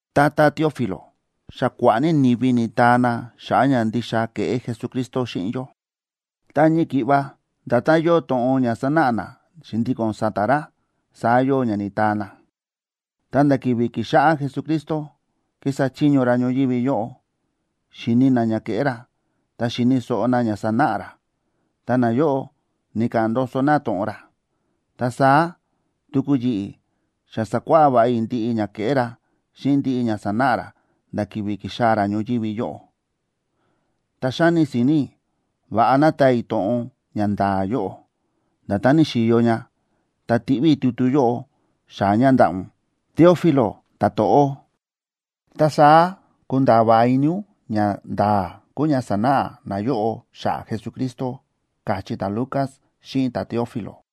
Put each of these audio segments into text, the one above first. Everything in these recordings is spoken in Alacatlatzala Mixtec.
“Tata Teófilo, xa kua̱ꞌa̱ ní ni̱vi ni̱taa na xa̱ꞌa̱ ña ndixa ke̱ꞌé Jesucristo xíꞌin yó. Ta ñii ki̱ꞌva nda̱tán yóo to̱ꞌon ña sa̱náꞌa na xi̱ndíko̱n sa̱ta̱ ra, saá yóo ña ni̱taa na. Ta nda̱ ki̱vi̱ ki̱xáꞌá Jesucristo kísa chiño ra ñoyívi yóꞌo, xi̱ni na ña ke̱ꞌé ra, ta xi̱ni̱ so̱ꞌo na ña sa̱náꞌa ra, ta nayóꞌo ni̱ka̱ꞌa̱n ndoso na to̱ꞌon ra. Ta saá tuku yi̱ꞌi̱ xa sa̱kuáꞌá va̱ꞌa i̱ ndiꞌi ña ke̱ꞌé ra xíꞌin ndiꞌi ña sa̱náꞌa ra nda̱ ki̱vi̱ ki̱xaa̱ ra ñoyívi yóꞌo. Ta xáni si̱ni̱ i̱ va̱ꞌa ná taa i̱ to̱ꞌon ña nda̱a̱ yóꞌo, nda̱tán ni̱xi̱yo ña, ta tiꞌví i̱ tutu yóꞌo xaa̱ ña ndaꞌa̱ ún, Teófilo ta̱to̱ꞌó. Ta saá kunda̱a̱ va̱ꞌa ini ún ñanda̱a̱ kúu ña xa sa̱náꞌa na yóꞌó xa̱ꞌa̱ Jesucristo”, káchí ta̱Lucas xíꞌin ta̱Teófilo.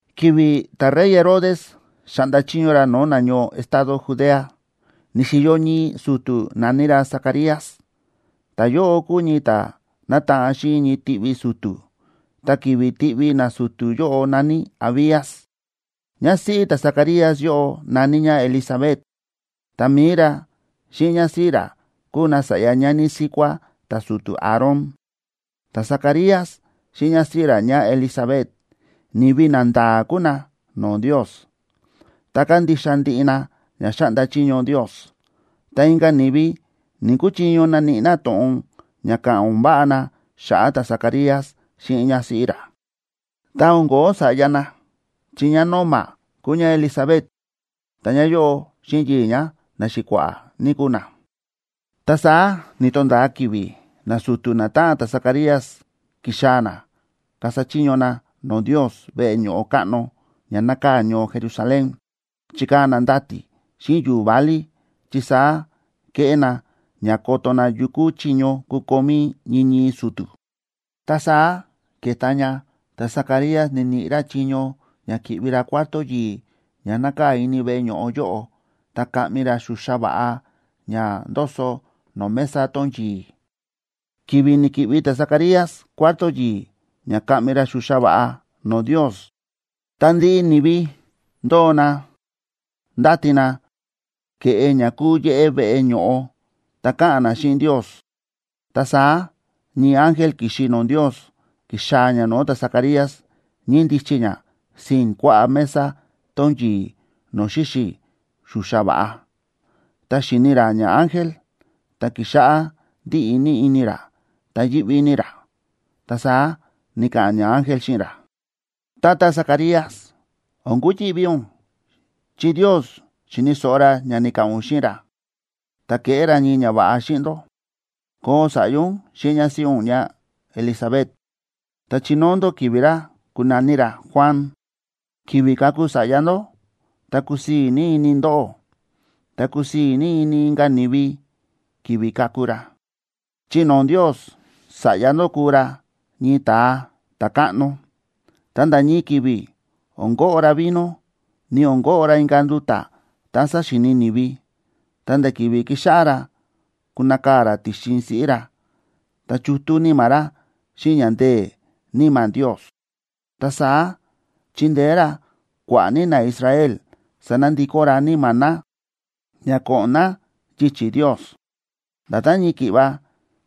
Ki̱vi̱ ta̱rey Herodes xáꞌnda chiño ra no̱o̱ nañoo estado Judea, ni̱xi̱yo ñii su̱tu̱ na̱ní ra Zacarías. Ta̱yóꞌo kúu ñii ta̱ nátaꞌan xíꞌin ñii tiꞌvi su̱tu̱, ta ki̱vi̱ tiꞌvi nasu̱tu̱ yóꞌo na̱ní Abías. Ñásíꞌí ta̱Zacarías yóꞌo na̱ní ñá Elisabet, ta mi̱i ra xíꞌin ñásíꞌí ra kúu na sa̱ꞌya ñani síkuá ta̱su̱tu̱ Aarón. Ta̱Zacarías xíꞌin ñásíꞌí ra ñáElisabet ni̱vi nanda̱a̱ kúu na no̱o̱ Ndios, ta kándixa ndiꞌi na ña xáꞌnda chiño Ndios, ta inka̱ ni̱vi ni̱‑kuchiño naníꞌi na to̱ꞌon ña ka̱ꞌa̱n o̱n váꞌa na xa̱ꞌa̱ ta̱Zacarías xíꞌin ñásíꞌí ra. Ta o̱n ko̱ó sa̱ꞌya na, chi ñá nóma kúu ñáElisabet, ta ñáyóꞌo xíꞌin yii̱ ñá na xi̱kua̱ꞌa̱ ní kúu na. Ta saá ni̱to̱nda̱a ki̱vi̱ nasu̱tu̱ natáꞌan ta̱Zacarías ki̱xaa̱ na kasa chiño na no̱o̱ Ndios veꞌe ño̱ꞌo káꞌno ña nákaa̱ ñoo Jerusalén. Chi̱kaa̱ na ndati̱ xíꞌin yu̱u̱ válí chi saá kéꞌé na ña koto na yukú chiño kukomí ñii ñii su̱tu̱. Ta saá ke̱ta ña ta̱Zacarías ni̱niꞌi ra chiño ña ki̱ꞌvi ra cuarto yi̱i̱ ña nákaa̱ ini veꞌe ño̱ꞌo yóꞌo, ta kaꞌmi ra xuxa va̱ꞌa ña ndoso no̱o̱ mesa tón yi̱i̱. Ki̱vi̱ ni̱ki̱ꞌvi ta̱Zacarías cuarto yi̱i̱ ña kaꞌmi ra xuxa va̱ꞌa no̱o̱ Ndios, ta ndiꞌi ni̱vi ndóo na ndáti na ke̱ꞌe ña kúu yéꞌé veꞌe ño̱ꞌo, ta káꞌa̱n na xíꞌin Ndios. Ta saá ñii ángel ki̱xi no̱o̱ Ndios ki̱xaa̱ ña no̱o̱ ta̱Zacarías, ñíndichi ña sii̱n kuaꞌá mesa tón yi̱i̱ no̱o̱ xíxi̱ xuxa va̱ꞌa. Ta xi̱ni ra ñaángel, ta ki̱xáꞌá ndíꞌi ní ini ra, ta yíꞌví ní ra. Ta saá ni̱ka̱ꞌa̱n ñaángel xíꞌin ra: ―Tata Zacarías, o̱n kuyi̱ꞌví ún, chi Ndios xi̱ni̱ so̱ꞌo ra ña ni̱ka̱ꞌa̱n ún xíꞌin ra, ta keꞌé ra ñii ñava̱ꞌa xíꞌin ndó: koo sa̱ꞌya ún xíꞌin ñásíꞌí ún ñáElisabet, ta chinóo ndó ki̱vi̱ ra kunaní ra Juan. Ki̱vi̱ kaku sa̱ꞌya ndó, ta kusii̱ ní ini ndóꞌó. Ta kusii̱ ní ini inka̱ ni̱vi ki̱vi̱ kaku ra, chi no̱o̱ Ndios sa̱ꞌya ndó kuu ra ñii ta̱a ta̱káꞌno. Ta nda̱ ñii ki̱vi̱ o̱n koꞌo ra vino, ni o̱n koꞌo ra inka̱ nduta̱ tá sáxíini ni̱vi. Ta nda̱ ki̱vi̱ kixáꞌá ra kunakaa̱ ra ti̱xin siꞌí ra, ta chútú níma̱ ra xíꞌin ña ndee̱ Níma̱ Ndios. Ta saá chindeé ra kua̱ꞌa̱ ní naIsrael sanandikó ra níma̱ na ña ko̱ꞌo̱n na yichi̱ Ndios. Nda̱tán ñii ki̱ꞌva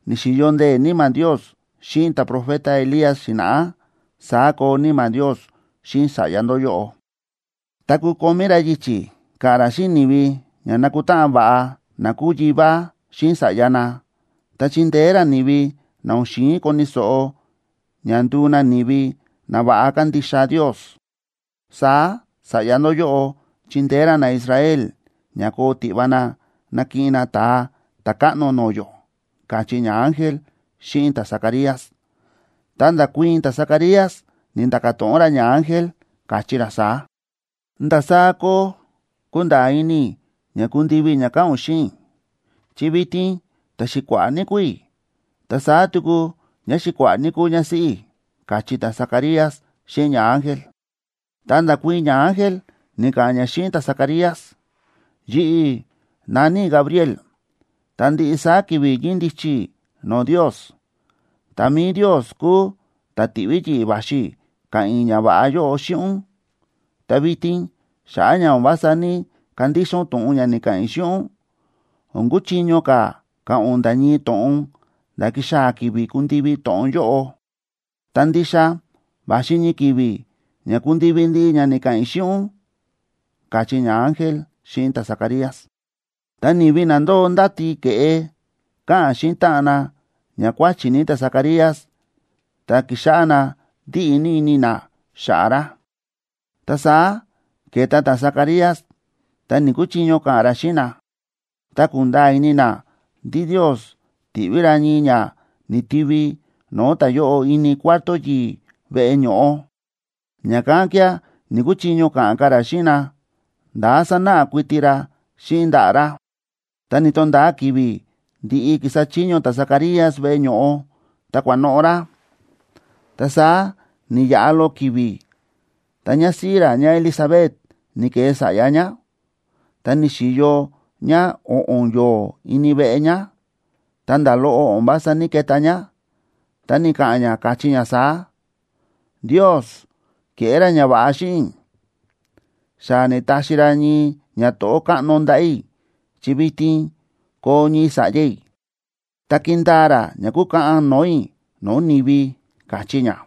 ni̱xi̱yo ndee̱ Níma̱ Ndios xíꞌin ta̱profeta Elías xi̱na̱ꞌá, saá koo Níma̱ Ndios xíꞌin sa̱ꞌya ndó yóꞌo. Ta kukomí ra yichi̱ ka̱ꞌa̱n ra xíꞌin ni̱vi ña nakutáꞌan va̱ꞌa na kúu yivá xíꞌin sa̱ꞌya na. Ta chindeé ra ni̱vi na o̱n xi̱in koni̱ so̱ꞌo ña nduu na ni̱vi na va̱ꞌa kandixa Ndios. Saá sa̱ꞌya ndó yóꞌo chindeé ra naIsrael ña koo tiꞌva na nakiꞌin na Ta̱a Ta̱káꞌno no̱o̱ yó ―káchí ñaángel xíꞌin ta̱Zacarías. Ta nda̱kuii̱n ta̱Zacarías, ni̱nda̱ka̱ to̱ꞌon ra ñaángel, káchí ra saá: ―¿Ndasaá koo kunda̱a̱ ini i̱ ña kundivi ña káꞌa̱n ún xíꞌin i̱?, chi vitin ta̱xi̱kua̱ꞌa̱ ní kúu i̱, ta saá tuku ñáxi̱kua̱ꞌa̱ ní kúu ñásíꞌí i̱ ―káchí ta̱Zacarías xíꞌin ñaángel. Ta nda̱kuii̱n ñaángel, ni̱ka̱ꞌa̱n ña xíꞌin ta̱Zacarías. ―Yi̱ꞌi̱ na̱ní i̱ Gabriel, ta ndiꞌi saá ki̱vi̱ ñíndichi i̱ no̱o̱ Ndios. Ta mi̱i Ndios kúu ta̱ ti̱ꞌví yi̱ꞌi̱ va̱xi i̱ ka̱ꞌa̱n i̱ ñava̱ꞌa yóꞌo xíꞌin ún. Ta vitin xa̱ꞌa̱ ña o̱n vása ní‑kandixa ún to̱ꞌon ña ni̱ka̱ꞌa̱n i̱ xíꞌin ún, o̱n kuchiño ka̱ ka̱ꞌa̱n ún nda̱ ñii to̱ꞌon nda̱ kixaa̱ ki̱vi̱ kundivi to̱ꞌon yóꞌo. Ta ndixa va̱xi ñii ki̱vi̱ ña kundivi ndiꞌi ña ni̱ka̱ꞌa̱n i̱ xíꞌin ún ―káchí ñaángel xíꞌin ta̱Zacarías. Ta ni̱vi na ndóo ndáti ke̱ꞌe, káꞌa̱n xíꞌin táꞌan na ña kuáchi̱ ní ta̱Zacarías, ta ki̱xáꞌá na ndíꞌi ní ini na xa̱ꞌa̱ ra. Ta saá ke̱ta ta̱Zacarías, ta ni̱‑kuchiño ka̱ꞌa̱n ra xíꞌin na. Ta ku̱nda̱a̱ ini na ndí Ndios ti̱ꞌví ra ñii ña ni̱tivi no̱o̱ ta̱yóꞌo ini cuarto yi̱i̱ veꞌe ño̱ꞌo. Ña̱kán kía̱ ni̱‑kuchiño ka̱ꞌa̱n ka̱ ra xíꞌin na, nda̱ sánáꞌa kuiti ra xíꞌin ndaꞌa̱ ra. Ta ni̱to̱nda̱a ki̱vi̱ ndi̱ꞌi ki̱sa chiño ta̱Zacarías veꞌe ño̱ꞌo, ta kua̱noꞌo̱ ra. Ta saá ni̱yaꞌa loꞌo ki̱vi̱, ta ñásíꞌí ra ñáElisabet ni̱ke̱e sa̱ꞌya ñá. Ta ni̱xi̱yo ñá o̱ꞌo̱n yo̱o̱ ini veꞌe ñá, ta nda̱ loꞌo o̱n vása ní‑keta ñá. Ta ni̱ka̱ꞌa̱n ñá, káchí ñá saá: “Ndios ke̱ꞌé ra ñava̱ꞌa xíꞌin i̱, xa ni̱taxi ra ñii ñato̱ꞌó káꞌno ndaꞌa̱ i̱ chi vitin koo ñii sa̱ꞌya i̱, ta ki̱ndaa ra ña kúkaꞌan no̱o̱ i̱ no̱o̱ ni̱vi”, káchí ñá.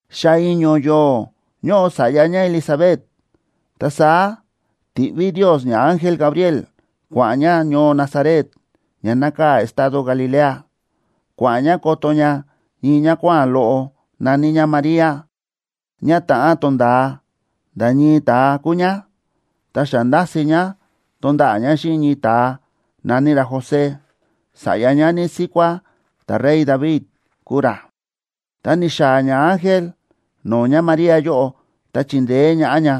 Xa i̱ño̱ yo̱o̱ ñóꞌo sa̱ꞌya ñáElisabet ta saá ti̱ꞌví Ndios ñaángel Gabriel kua̱ꞌa̱n ña ñoo Nazaret, ña nákaa̱ estado Galilea. Kua̱ꞌa̱n ña koto ña ñii ñákuáa̱n loꞌo na̱ní ñá María, ñá ta̱ꞌán tonda̱a nda̱ ñii ta̱a kúu ñá. Ta xa nda̱si̱ ña tonda̱ꞌa̱ ñá xíꞌin ñii ta̱a na̱ní ra José, sa̱ꞌya ñani síkuá ta̱rey David kúu ra. Ta ni̱xaa̱ ñaángel no̱o̱ ñáMaría yóꞌo ta chi̱ndeé ñaꞌá ña,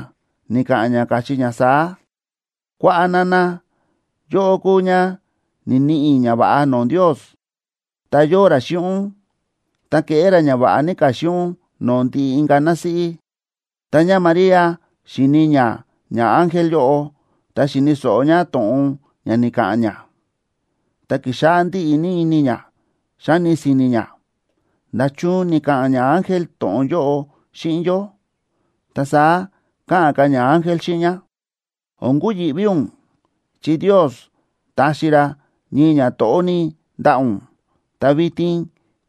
ni̱ka̱ꞌa̱n ña, káchí ña saá: ―¡Kuaꞌa, nana! Yóꞌó kúu ñá ni̱niꞌi ñava̱ꞌa no̱o̱ Ndios, ta yóo ra xíꞌin ún. Ta keꞌé ra ñava̱ꞌa ní ka̱ xíꞌin ún no̱o̱ ndiꞌi inka̱ násíꞌí. Ta ñáMaría xi̱ni ñá ñaángel yóꞌo, ta xi̱ni̱ so̱ꞌo ñá to̱ꞌon ña ni̱ka̱ꞌa̱n ña, ta ki̱xáꞌá ndíꞌi ní ini ñá, xáni si̱ni̱ ñá: “¿Nda̱chun ni̱ka̱ꞌa̱n ñaángel to̱ꞌon yóꞌo xíꞌin yó?” Ta saá káꞌa̱n ka̱ ñaángel xíꞌin ñá: ―O̱n kuyi̱ꞌví ún, chi Ndios taxi ra ñii ñato̱ꞌó ní ndaꞌa̱ ún. Ta vitin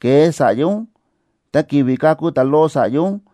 ke̱e sa̱ꞌya ún, ta ki̱vi̱ kaku ta̱loꞌo sa̱ꞌya ún,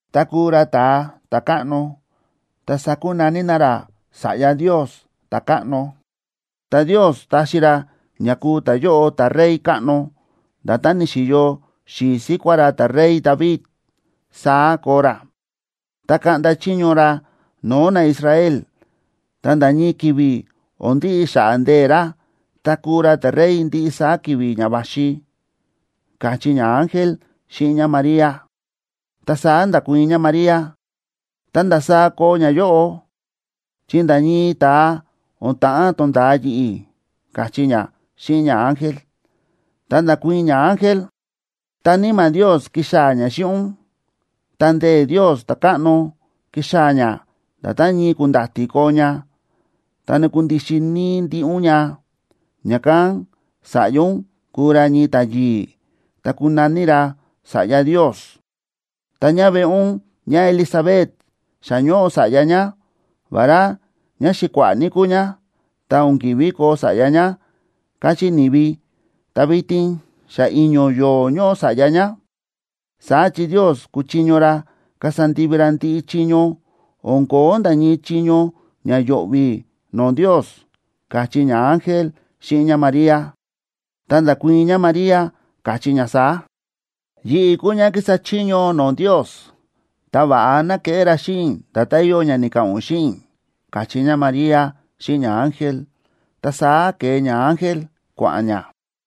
Ta kuu ra ta̱a ta̱káꞌno, ta sakunaní na ra Sa̱ꞌya Ndios ta̱káꞌno, ta Ndios taxi ra ña kuu ta̱yóꞌo ta̱rey káꞌno. Nda̱tán ni̱xi̱yo xi̱i̱ síkuá ra ta̱rey David, saá koo ra. Ta kaꞌnda chiño ra no̱o̱ naIsrael, ta nda̱ ñii ki̱vi̱ o̱n ndiꞌi xa̱ꞌa̱ ndee̱ ra, ta kuu ra ta̱rey ndiꞌi saá ki̱vi̱ ña va̱xi ―káchí ñaángel xíꞌin ñáMaría. Ta saá nda̱kuii̱n ñáMaría: ―¿Ta ndasaá koo ñayóꞌo?, chi nda̱ ñii ta̱a o̱n ta̱ꞌán tonda̱a yi̱ꞌi̱ ―káchí ñá xíꞌin ñaángel. Ta nda̱kuii̱n ñaángel: ―Ta Níma̱ Ndios kixaa̱ ña xíꞌin ún, ta ndee̱ Ndios ta̱káꞌno kixaa̱ ña nda̱tán ñii ku̱nda̱ti̱ koo ña, ta nakundixin níí ndiꞌi ún ña. Ña̱kán sa̱ꞌya ún kuu ra ñii ta̱a yi̱i̱, ta kunaní ra Sa̱ꞌya Ndios. Ta ñáveꞌe ún ñáElisabet xa ñóꞌo sa̱ꞌya ñá. Vará ñáxi̱kua̱ꞌa̱ ní kúu ñá, ta o̱n ki̱ví koo sa̱ꞌya ñá, káchí ni̱vi, ta vitin xa i̱ño̱ yo̱o̱ ñóꞌo sa̱ꞌya ñá. Saá chi Ndios kúchiño ra kasa ndivi ra ndiꞌi chiño, o̱n ko̱ó nda̱ ñii chiño ña yo̱ꞌvi̱ no̱o̱ Ndios ―káchí ñaángel xíꞌin ñáMaría. Ta nda̱kuii̱n ñáMaría, káchí ñá saá: ―Yi̱ꞌi̱ kúu ñá kísa chiño no̱o̱ Ndios, ta va̱ꞌa ná keꞌé ra xíꞌin i̱ nda̱tán yóo ña ni̱ka̱ꞌa̱n ún xíꞌin i̱ ―káchí ñáMaría xíꞌin ñaángel. Ta saá ke̱e ñaángel kua̱ꞌa̱n ña.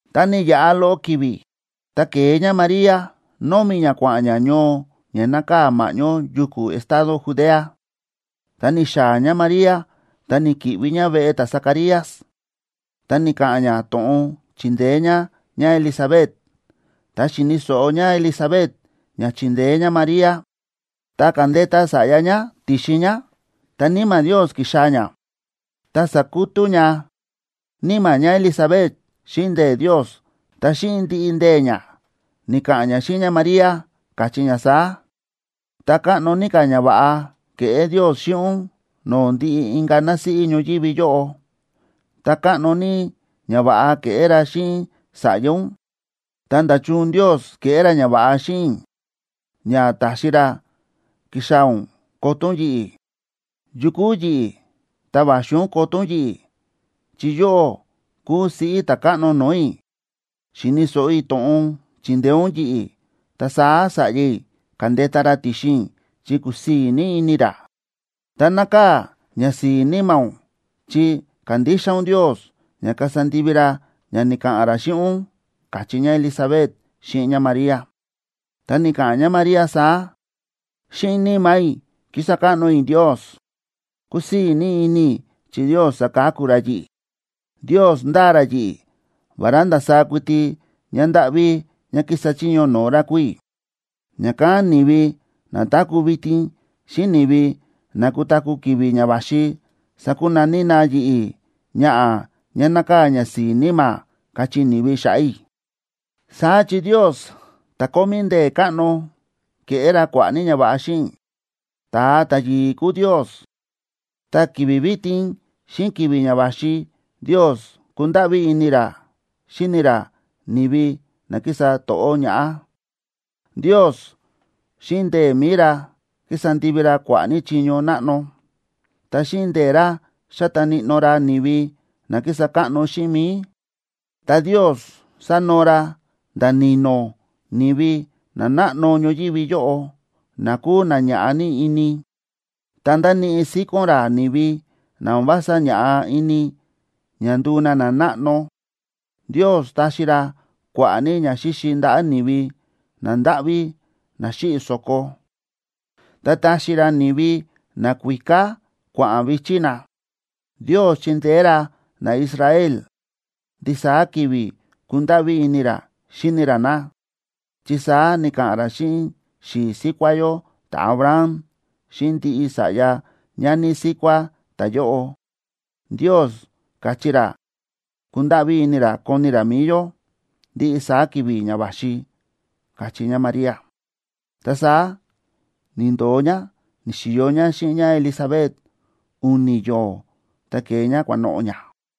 Ta ni̱yaꞌa loꞌo ki̱vi̱, ta ke̱e ñáMaría, nómi̱ ñá kua̱ꞌa̱n ñá ñoo ña nákaa̱ ma̱ꞌñó yuku̱ estado Judea. Ta ni̱xaa̱ ñáMaría, ta ni̱ki̱ꞌvi ñá veꞌe ta̱Zacarías, ta ni̱ka̱ꞌa̱n ñá to̱ꞌon chindeé ñá ñáElisabet. Tá xi̱ni̱ so̱ꞌo ñáElisabet ña chi̱ndeé ñáMaría, ta ka̱ndeta sa̱ꞌya ñá ti̱xin ñá, ta Níma̱ Ndios ki̱xaa̱ ña, ta sa̱kutú ña níma̱ ñáElisabet xíꞌin ndee̱ Ndios. Ta xíꞌin ndiꞌi ndee̱ ñá ni̱ka̱ꞌa̱n ñá xíꞌin ñáMaría, káchí ñá saá: ―¡Ta káꞌno ní ka̱ ñava̱ꞌa ke̱ꞌé Ndios xíꞌin ún no̱o̱ ndiꞌi inka̱ násíꞌí ñoyívi yóꞌo! ¡Ta káꞌno ní ñava̱ꞌa keꞌé ra xíꞌin sa̱ꞌya ún! Ta, ¡nda̱chun Ndios ke̱ꞌé ra ñava̱ꞌa xíꞌin i̱ ña ta̱xi ra ki̱xaa̱ ún koto ún yi̱ꞌi̱! ¡Yu kúu yi̱ꞌi̱, ta va̱xi ún koto ún yi̱ꞌi̱! Chi yóꞌó kúu siꞌí Ta̱káꞌno no̱o̱ i̱. Xi̱ni̱ so̱ꞌo i̱ to̱ꞌon chi̱ndeé ún yi̱ꞌi̱, ta saá sa̱ꞌya i̱ ka̱ndeta ra ti̱xin i̱ chi kúsii̱ ní ini ra. Ta nákaa̱ ñasi̱i̱ níma̱ ún, chi kándixa ún Ndios ña kasa ndivi ra ña ni̱ka̱ꞌa̱n ra xíꞌin ún ―káchí ñáElisabet xíꞌin ñáMaría. Ta ni̱ka̱ꞌa̱n ñáMaría saá: Xíꞌin níma̱ i̱ kísa káꞌno i̱ Ndios. Kúsii̱ ní ini i̱ chi Ndios sáka̱ku ra yi̱ꞌi̱. Ndios ndáa ra yi̱ꞌi̱, vará ndasaá kuiti ñándáꞌví ñá kísa chiño no̱o̱ ra kúu i̱. Ña̱kán ni̱vi na táku̱ vitin xíꞌin ni̱vi na kutaku̱ ki̱vi̱ ña va̱xi sakunaní na yi̱ꞌi̱: Ñaꞌa̱ ñá nákaa̱ ñasi̱i̱ níma̱, kachí ni̱vi xa̱ꞌa̱ i̱. Saá chi Ndios ta̱ kómí ndee̱ káꞌno, ke̱ꞌé ra kua̱ꞌa̱ ní ñava̱ꞌa xíꞌin i̱. ¡Ta̱a ta̱yi̱i̱ kúu Ndios! Ta ki̱vi̱ vitin xíꞌin ki̱vi̱ ña va̱xi Ndios kúndáꞌví ini ra xíni ra ni̱vi na kísa to̱ꞌó ñaꞌá. Ndios xíꞌin ndee̱ mi̱i ra ki̱sa ndivi ra kua̱ꞌa̱ ní chiño náꞌno. Ta xíꞌin ndee̱ ra xa̱ta níꞌnó ra ni̱vi na kísa káꞌno xíꞌin mi̱i. Ta Ndios sa̱noo ra nda̱ ni̱no̱ ni̱vi nanáꞌno ñoyívi yóꞌo, na kúu na ña̱ꞌa ní ini, ta nda̱níꞌi síkón ra ni̱vi na o̱n vása ña̱ꞌa ini ña nduu na nanáꞌno. Ndios ta̱xi ra kua̱ꞌa̱ ní ñaxíxi ndaꞌa̱ ni̱vi nandáꞌví na xíꞌi̱ so̱ko, ta ta̱xi ra ni̱vi nakuíká kua̱ꞌa̱n vi̱chí na. Ndios chi̱ndeé ra naIsrael, ndisaá ki̱vi̱ kúndáꞌví ini ra xíni ra na, chi saá ni̱ka̱ꞌa̱n ra xíꞌin xi̱i̱ síkuá yó ta̱Abraham, ta xíꞌin ndiꞌi sa̱ꞌya ñani síkuá ta̱yóꞌo. Ndios ka̱chí ra kundáꞌví ini ra koni ra mi̱i yó ndiꞌi saá ki̱vi̱ ña va̱xi, káchí ñáMaría. Ta saá ni̱ndo̱o ñá, ni̱xi̱yo ñá xíꞌin ñáElisabet u̱ni̱ yo̱o̱, ta ke̱e ñá kua̱noꞌo̱ ñá.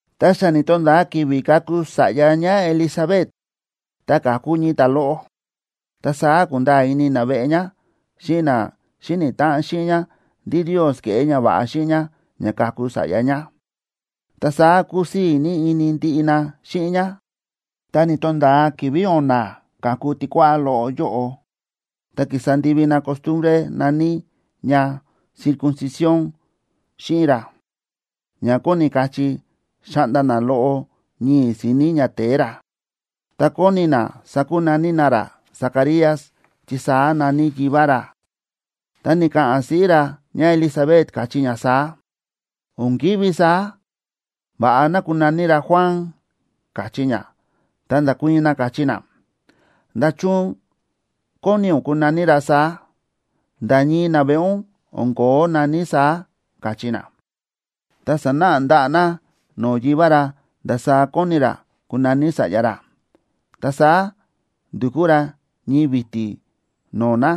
Tá xa ni̱to̱nda̱a ki̱vi̱ kaku sa̱ꞌya ñáElisabet, ta ka̱ku ñii ta̱a loꞌo. Ta saá ku̱nda̱a̱ ini naveꞌe ñá xíꞌin na xíni̱ táꞌan xíꞌin ñá ndí Ndios ke̱ꞌé ñava̱ꞌa xíꞌin ñá ña ka̱ku sa̱ꞌya ñá. Ta saá kúsii̱ ní ini ndiꞌi na xíꞌin ñá. Ta ni̱to̱nda̱a ki̱vi̱ o̱na̱ ka̱ku tikuáꞌá loꞌo yóꞌo, ta ki̱sa ndivi na costumbre na̱ní ña circuncisión xíꞌin ra ña kóni kachí xáꞌnda na loꞌo ñii̱ si̱ni̱ ñate̱e ra. Ta kóni na sakunaní na ra Zacarías, chi saá na̱ní yivá ra. Ta ni̱ka̱ꞌa̱n siꞌí ra ñáElisabet, káchí ñá saá: ―O̱n ki̱ví saá, va̱ꞌa ná kunaní ra Juan ―káchí ñá. Ta nda̱kuii̱n na, káchí na: ―¿Nda̱chun kóni ún kunaní ra saá? Nda̱ ñii naveꞌe ún o̱n ko̱ó na̱ní saá ―káchí na. Ta sa̱náꞌa ndaꞌa̱ na no̱o̱ yivá ra ndasaá kóni ra kunaní sa̱ꞌya ra. Ta saá ndu̱kú ra ñii vi̱ti̱ no̱o̱ na,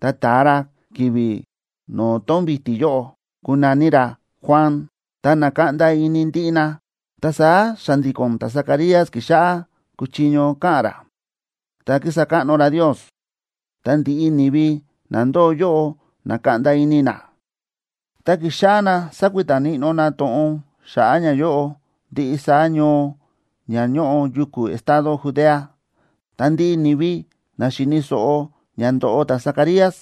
ta ta̱a ra ki̱vi̱ no̱o̱ tón vi̱ti̱ yóꞌo: “Kunaní ra Juan.” Ta na̱kaꞌnda ini ndiꞌi na. Ta saá xa̱ndi̱ko̱n ta̱Zacarías ki̱xáꞌá kúchiño ka̱ꞌa̱n ra, ta kísa káꞌno ra Ndios. Ta ndiꞌi ni̱vi na ndóo yóꞌo na̱kaꞌnda ini na, ta ki̱xáꞌá na sakuita níꞌnó na to̱ꞌon xa̱ꞌa̱ ñayóꞌo ndiꞌi saá ñoo ña ñóꞌo yuku̱ estado Judea. Ta ndiꞌi ni̱vi na xi̱ni̱ so̱ꞌo ña ndo̱ꞌo ta̱Zacarías,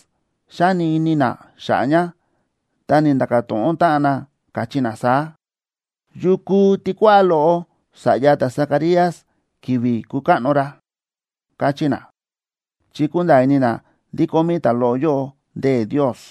xáni ini na xa̱ꞌa̱ ña, ta ni̱nda̱ka̱ to̱ꞌon táꞌan na, káchí na saá: ―¿Yu kuu tikuáꞌá loꞌo sa̱ꞌya ta̱Zacarías ki̱vi̱ kukáꞌno ra? ―káchí na, chi kúnda̱a̱ ini na ndí kómí ta̱loꞌo yóꞌo ndee̱ Ndios.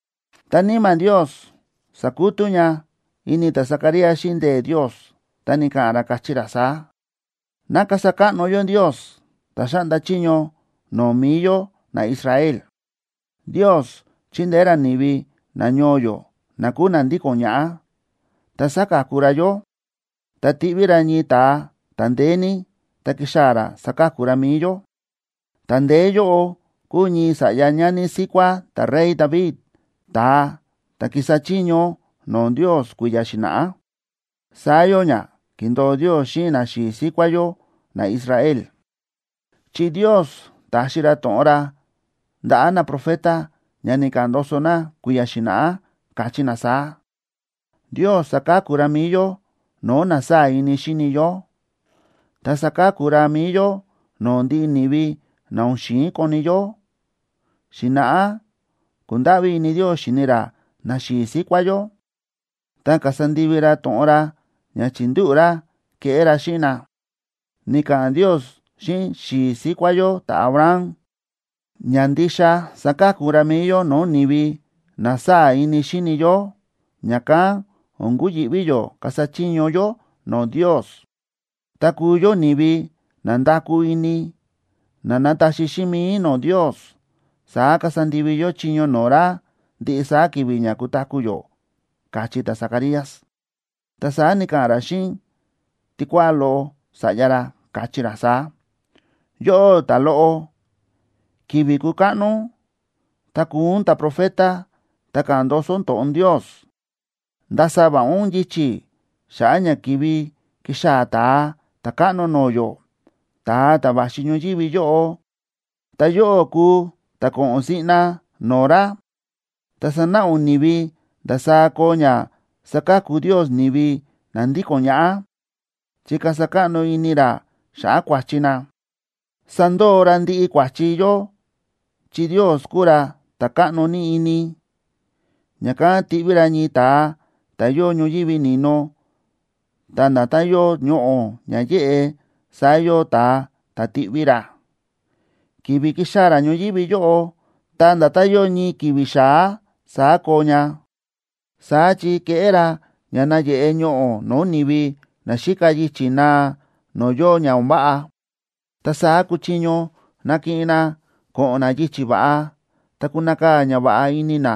Ta Níma̱ Ndios sa̱kutú ña ini ta̱Zacarías xíꞌin ndee̱ Ndios, ta ni̱ka̱ꞌa̱n ra, káchí ra saá: Ná kasa káꞌno yó Ndios, ta̱ xáꞌnda chiño no̱o̱ mi̱i yó naIsrael, Ndios chi̱ndeé ra ni̱vi nañoo yó na kúu na ndíko̱n ñaꞌá, ta sa̱ka̱ku ra yó. Ta ti̱ꞌví ra ñii ta̱a ta̱ ndeé ní, ta kixaa̱ ra saka̱ku ra mi̱i yó. Ta̱ ndeé yóꞌo kúu ñii sa̱ꞌya ñani síkuá ta̱rey David, ta̱a ta̱ ki̱sa chiño no̱o̱ Ndios kui̱ya̱ xi̱na̱ꞌá. Saá yóo ña ki̱ndo̱o Ndios xíꞌin naxi̱i̱ síkuá yó naIsrael, chi Ndios ta̱xi ra to̱ꞌon ra ndaꞌa̱ naprofeta ña ni̱ka̱ꞌa̱n ndoso na kui̱ya̱ xi̱na̱ꞌá, káchí na saá: Ndios saka̱ku ra mi̱i yó no̱o̱ na sáa̱ ini xíni yó, ta saka̱ku ra mi̱i yó no̱o̱ ndiꞌi ni̱vi na o̱n xi̱in koni yó. Xi̱na̱ꞌá ku̱ndáꞌví ini Ndios xi̱ni ra naxi̱i̱ síkuá yó, ta kasa ndivi ra to̱ꞌon ra ña chi̱ndúꞌu̱ ra keꞌé ra xíꞌin na. Ni̱ka̱ꞌa̱n Ndios xíꞌin xi̱i̱ síkuá yó ta̱Abraham ña ndixa saka̱ku ra mi̱i yó no̱o̱ ni̱vi na sáa̱ ini xíni yó, ña̱kán o̱n kuyi̱ꞌví yó kasa chiño yó no̱o̱ Ndios. Ta kuu yó ni̱vi na nda̱kú ini, na nataxi xíꞌin mi̱i no̱o̱ Ndios, saá kasa ndivi yó chiño no̱o̱ ra ndiꞌi saá ki̱vi̱ ña kutaku̱ yó, káchí ta̱Zacarías. Ta saá ni̱ka̱ꞌa̱n ra xíꞌin tikuáꞌá loꞌo sa̱ꞌya ra, káchí ra saá: Yóꞌó, ta̱loꞌo, ki̱vi̱ kukáꞌno ún, ta kuu ún ta̱profeta ta̱ ka̱ꞌa̱n ndoso to̱ꞌon Ndios. Ndasa va̱ꞌa ún yichi̱ xa̱ꞌa̱ ña kivi kixaa̱ Ta̱a Ta̱káꞌno no̱o̱ yó, ta̱a ta̱ va̱xi ñoyívi yóꞌo, ta yóꞌó kuu ta̱ ko̱ꞌo̱n siꞌna no̱o̱ ra. Ta sanáꞌa ún ni̱vi ndasaá koo ña saka̱ku Ndios ni̱vi na ndíko̱n ñaꞌá, chi kasa káꞌno ini ra xa̱ꞌa̱ kua̱chi na. Sandoo ra ndiꞌi kua̱chi yó chi Ndios kúu ra ta̱ káꞌno ní ini. Ña̱kán tiꞌví ra ñii ta̱a ta̱ yóo ñoyívi ni̱no, ta nda̱tán yóo ñoꞌo̱ ña yéꞌe, saá yóo ta̱a ta̱ tiꞌví ra. Ki̱vi̱ kixaa̱ ra ñoyívi yóꞌo, ta nda̱tán yóo ñii ki̱vi̱ xa̱á, saá koo ña. Saá chi keꞌé ra ña nayeꞌe ñoꞌo̱ no̱o̱ ni̱vi naxíka yichi̱ naa no̱o̱ yóo ña o̱n váꞌa, ta saá kuchiño nakiꞌin na ko̱ꞌo̱n na yichi̱ va̱ꞌa, ta kunakaa̱ ñava̱ꞌa ini na,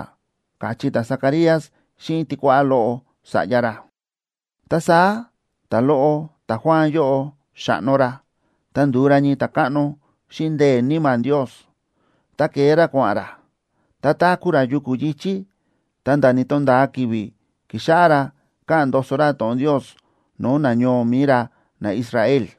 káchí ta̱Zacarías xíꞌin tikuáꞌá loꞌo sa̱ꞌya ra. Ta saá ta̱loꞌo ta̱Juan yóꞌo xa̱ꞌno ra, ta ndu̱u ra ñii ta̱káꞌno xíꞌin ndee̱ Níma̱ Ndios. Ta ke̱e ra kua̱ꞌa̱n ra, ta táku̱ ra yuku̱ yi̱chí ta̱nda̱ ni̱to̱nda̱a ki̱vi̱ ki̱xáꞌá ra káꞌa̱n ndoso ra to̱ꞌon Ndios no̱o̱ nañoo mi̱i ra naIsrael.